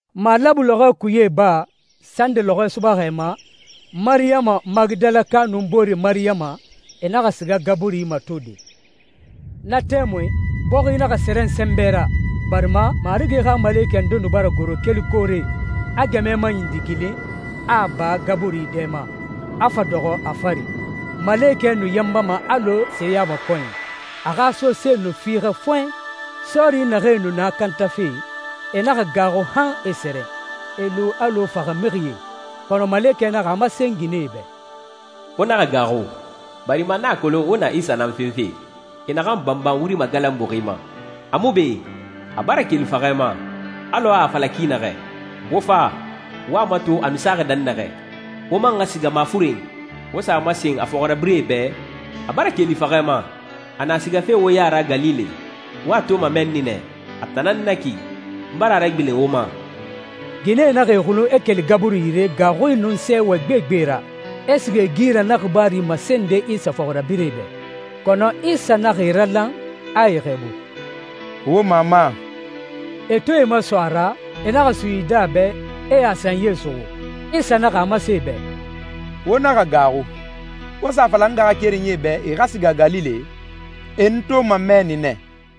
Malabu lɔxɔɛ kuye iba, sande lɔxɔɛ subaxɛ ma, Mariyama Magidalaka nun boore Mariyama, e naxa siga gaburi matode. Na tɛmui, bɔxi naxa sɛrɛn sɛnbɛ ra, barima Marigi xa malekɛ nde nu bara goro keli koore, a gɛmɛ maɲindigilin, a a ba gaburi dɛ ma, a fa dɔxɔ a fari. Malekɛ nu yanbama alɔ seyamakɔnyi, a xa sosee nu fiixɛ fɔɛn. Sɔɔri naxee nu na kantafe, e naxa gaaxu han e sɛrɛn, e lu alɔ faxamixie. Kɔnɔ malekɛ naxa a masen ginɛe bɛ, «Wo naxa gaaxu, barima n a kolon wo na Isa nan fenfe, e naxan banban wuri magalanbuxi ma. A mu be, a bara keli faxɛ ma, alɔ a a fala ki naxɛ. Wo fa, wo a mato a nu saxi dɛnnaxɛ. Wo man xa siga mafuren, wo sa a masen a fɔxirabirɛe bɛ, ‹A bara keli faxɛ ma. A na sigafe wo ya ra Galile. Wo a toma mɛnni nɛ.› A tan nan na ki, n bara a ragbilen wo ma.» Ginɛe naxa e xulun, e keli gaburi yire, gaaxui nun sɛɛwɛ gbegbe ra, e siga e gi ra na xibaaru masende Isa fɔxirabirɛe bɛ. Kɔnɔ Isa naxa e ralan, a e xɛɛbu, «Wo mama.» E to e maso a ra, e naxa suyidi a bɛ, e a sanyie suxu. Isa naxa a masen e bɛ, «Wo naxa gaaxu. Wo sa a fala n ngaxakerenyie bɛ e xa siga Galile. E n toma mɛnni nɛ.»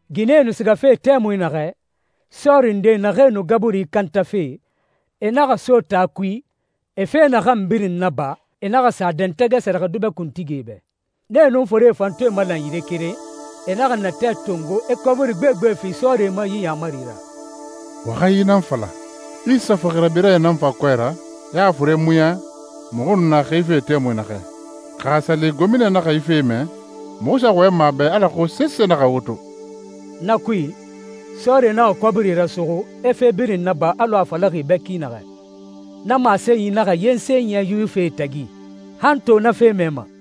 Ginɛe nu sigafe tɛmui naxɛ, sɔɔri nde naxee nu gaburi kantafe, e naxa so taa kui. Fe naxan birin naba, e naxa sa a dɛntɛgɛ sɛrɛxɛdubɛ kuntigie bɛ. Nee nun forie fan to e malan yire keren, e naxa natɛ tongo, e kɔbiri gbegbe fi sɔɔrie ma yi yaamari ra, «Wo xa yi nan fala, ‹Isa fɔxirabirɛe nan fa kɔɛ ra, e a fure muɲa muxu nu na xife tɛmui naxɛ.› Xa a sa li gomina naxa yi fe mɛ, muxu sa wɔyɛnma a bɛ alako sese naxa wo to.» Na kui, sɔɔrie naxa kɔbiri rasuxu, e fe birin naba alɔ a falaxi e bɛ ki naxɛ. Na masenyi naxa yensen yɛ Yuwifie tagi. Han to na fe mɛma.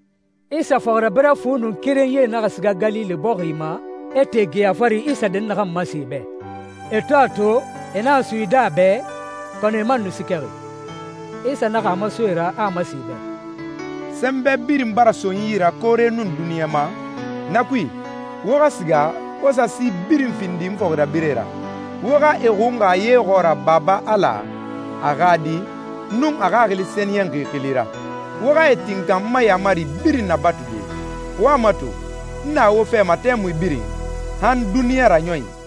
Isa fɔxirabirɛ fu nun kerenyie naxa siga Galile bɔxi ma, e te geya fari Isa dɛnnaxan masen e bɛ. E to a to, e naxa suyidi a bɛ, kɔnɔ e man nu siikɛxi. Isa naxa a maso e ra, a a masen e bɛ, «Sɛnbɛ birin bara so n yi ra koore nun duniɲa ma. Na kui, wo xa siga, wo sa si birin findi n fɔxirabirɛe ra. Wo xa e xunxa ye xɔɔra Baba Ala, a xa Di, nun a Xaxili Sɛniyɛnxi xili ra. Wo xa e tinkan n ma yaamari birin nabatude. Wo a mato, n na wo fɛ ma tɛmui birin, han duniɲa raɲɔnyi.»